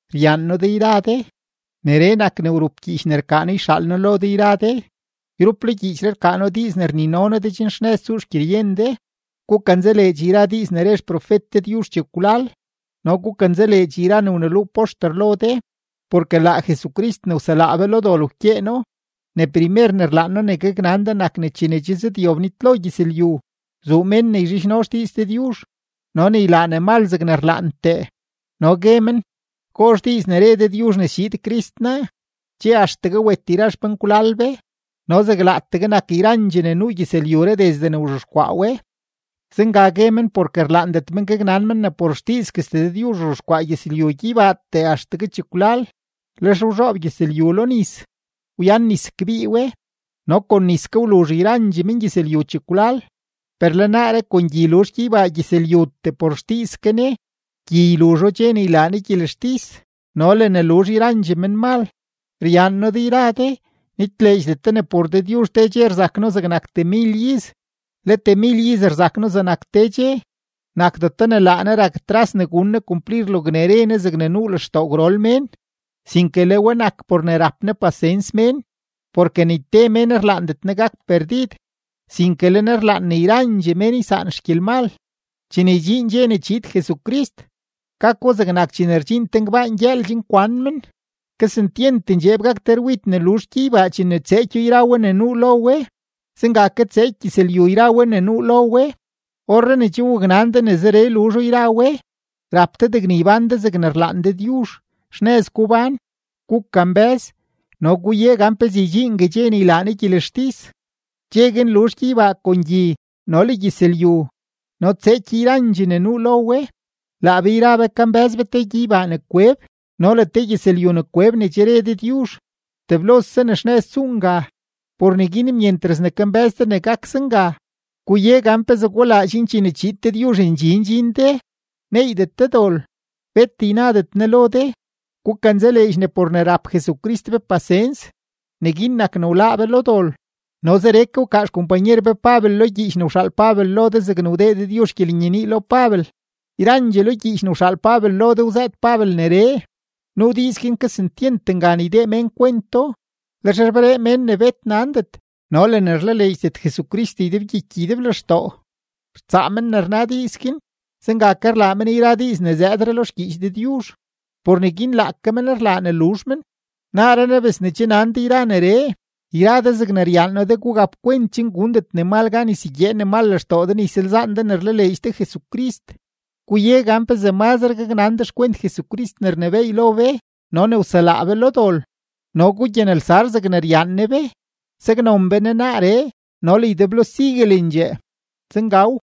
Ryaan noo de yra de; neree nak ne wrup gyiich ne rkaa noo yxaal noo lo de yra de. Yrup lo gyiichree rkaa noo diiz ne rnino noo de chen tsuxnëz xgyeryen de. Gukanzaleedx yra diiz ne re xprofet Dëdyuzh chekwlal no gukanzaleedx yra ne wneluu poxter lo de, porke laa Jesucrist ne wselaa be lo dol wkyeeno. Ne primer ne rlaan noo ne gaknan de nak ne chene che zëdyob nitlo gyëzlyu, zuu mén ne yzhidxno xdiiz Dëdyuzh no ne ylaa ne mal zegne rlaantee. No gue men: “¿Gozh diiz ne re Dëdyuzh ne schiid Crist naa? Che axtegue wet yra xpenkwlal be, no zeg laateegue nak yrandxee ne nuu gyëzlyuree desde ne wzhexkwaa we.” Zenga gue men porke rlaandet men gaknan men ne por xdiizguestee Dëdyuzh wzhexkwaa gyeybaa gyëzlyutee axtegue chekwlal, lex wzhoob gyëzlyu lo nis, wyan nis kbii we. No kon nis ke wluzh yrandxee mengyëzlyu chekwlal. Per le naaree kon gyi luzh gyeybaa gyëzlyutee por xdiiz ke Ne. Gyi yluzho dxe ne ylaa Ne gyelextis no le ne luzh yrandxee menmal. Ryaan noo de yra de; nitleedxdet de ne por Dëdyuzh te dxe rzak No zegnak temil iz, le temil iz rzak No zegnak te dxe. Nakdeto ne laa Ne rak tras ne gun Ne kumplir logne re Ne, zegne nuu lextoo gwrol mén, sinke le we nak por ne rap Ne pasens mén, porke ni te mén rlaandet Ne gak perdid, sinke le Ne rlaan ne yrandxee mén ysaan xgyelmal. Chene ydxiin dxe ne chiid Jesucrist, gako zegnak chene rdxiin te ngbaan gyëël chen kwan men. Kesentyent ndxeeb gak te rwid ne luzh gyeybaa chene tseekyo yra we ne nuu lo we; zenga ke tseeky gyëzlyu yra we ne nuu lo we. Orree ne che waknan de ne zeree luzho yra we, rap de degne ybán de zegne rlaan Dëdyuzh, xnëz gubán. Gukambë́z no guye gan pezee ydxiingue dxe ne ylaa Ne gyelextis. Dxe guin luzh gyeybaa kon gyi no le gyëzlyu no tseeky yrandxee ne nuu lo we. Laa be yra be kambë́z be te gyeybaa ne kweb no le te gyëzlyu ne kweb ne che re Dëdyuzh; teblose ne xnëz tsuu nga. Por neguin myentras ne kambë́z de ne gak zenga, guye gan pezee gulaa chen chene chiid Dëdyuzh ndxi ndxin de, neeydet de dol, bet ynadet Ne lo de. Gukanzaleedx ne por ne rap Jesucrist be pasens, neguin nak ne wláá be lo dol. No zeree ke wkaa xkompanyer be Pabel lo gyiich ne wxaal Pabel lo de zegne wdee Dëdyuzh gyelenyenii lo Pabel. Yrandxee lo gyiich ne wxaal Pabel lo de wzëët Pabel neree. Nuu diiz guin kesentyent ngan ydee mén kwento; lex rberee mén ne bet nandet no le mén ne rlaleedxdet Jesucrist ydebgyiky ydeblextoo, rtsaa men ne rna diiz guin; zenga ke rlaa men yra diiz ne zëëdre lo xgyiich Dëdyuzh. Por neguin laake men rlaa ne luzh men. Naaree naa bes ne che nan de yra neree, yra de zegne ryaan noo de gugap kwent chen gundet menmal gan ysegyee men lextoo de ne ysalzaan de ne rlaleedx de Jesucrist. Guye gan pezee mazre gaknan de xkwent Jesucrist ne rnebééy lo be no ne wselaa be lo dol, no gugyanelsar zegne ryaan Ne be. ¡Saknon be Ne naaree no le ydeblo siguelendxee! Zengaw.